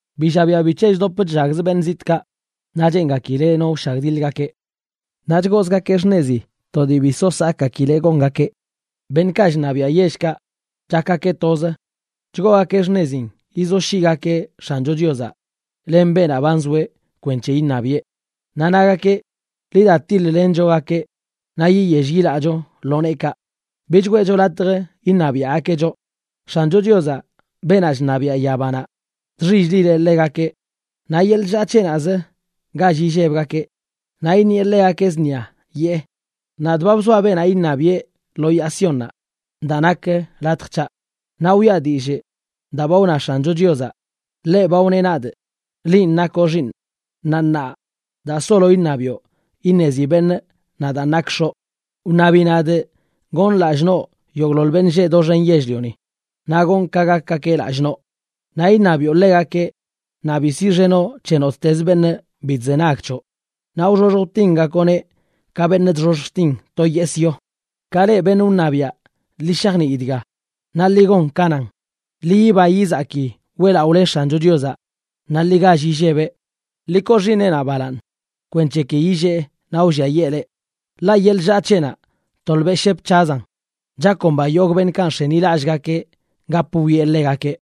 Bi llabiaꞌ bic̱he chdop chllagzə beṉꞌ zitꞌkaꞌ naꞌ cheengakileꞌ no wshagdiḻgakeꞌ. Naꞌ chgoozgakeꞌ xṉezi to dii bi so sakgakileꞌ gongakeꞌ. Beṉꞌkaꞌ chṉabiaꞌ yellkaꞌ, chakgakeꞌ toz chgoogakeꞌ xṉezin yizoshyiꞌgakeꞌ X̱ancho Chiozaꞌ len beenaꞌ ba nzoeꞌ kwenc̱he iṉabiꞌe. Naꞌ nagakeꞌ: “Ḻi da tiḻ-lenchogakeꞌ naꞌ yiyell yilaꞌcho lo neekaꞌ. Bich weꞌcho latj iṉabiaꞌgakeꞌ choꞌ.” X̱ancho Chiozaꞌ, beenaꞌ chṉabiaꞌ yabanaꞌ, chxill-lileꞌ ḻegakeꞌ. Naꞌ yeḻꞌ chllaa c̱heꞌnaꞌzə gall illebgakeꞌ, naꞌ iṉieꞌ ḻegakeꞌ zṉia, yee: “Nadꞌ ba bzoaꞌ beenaꞌ iṉabiꞌe lo yaa Siónnaꞌ, daa nak latj c̱haꞌ.” Naꞌ wiꞌa dillꞌ daa ba wna X̱ancho Chiozaꞌ. Ḻeꞌ ba wneꞌ nadꞌ: “Linꞌ nakoꞌ xiiṉꞌ, naꞌ ṉaa daa solo iṉabiꞌo iṉezi beṉꞌ nadaan nakꞌ X̱oꞌ. Wṉabi nadꞌ gonꞌ lallꞌ noꞌ yogꞌḻoḻ beṉꞌ lleꞌ doxen yell-lioni, naꞌ gonꞌ ka gakgakeꞌ lallꞌ noꞌ. Naꞌ iṉabiꞌo ḻegakeꞌ, naꞌ bi siꞌxenoꞌ c̱he nottez beṉꞌ bi chzenag c̱hoꞌ, naꞌ wxoxj wtingakoꞌneꞌ ka beṉꞌ chxoxj chtin to yesꞌ yo.” Ka leꞌ beṉꞌ wṉabiaꞌ, ḻi shajnii dga, ¡naꞌ ḻi gon ka nan! Ḻi yiba yizaki weꞌlaꞌole X̱ancho Chiozaꞌ naꞌ ḻi gall illebeꞌ. Ḻi koo Xiiṉeꞌnaꞌ balaaṉ kwenc̱he ki illee naꞌ wlliayee leꞌ, ḻaꞌ yeḻꞌ chllaa c̱heꞌnaꞌ tolbeꞌ shep c̱hazan. ¡Chakomba yogꞌ beṉꞌkaꞌ nx̱enilallꞌgakeꞌ gap wwieꞌ ḻegakeꞌ!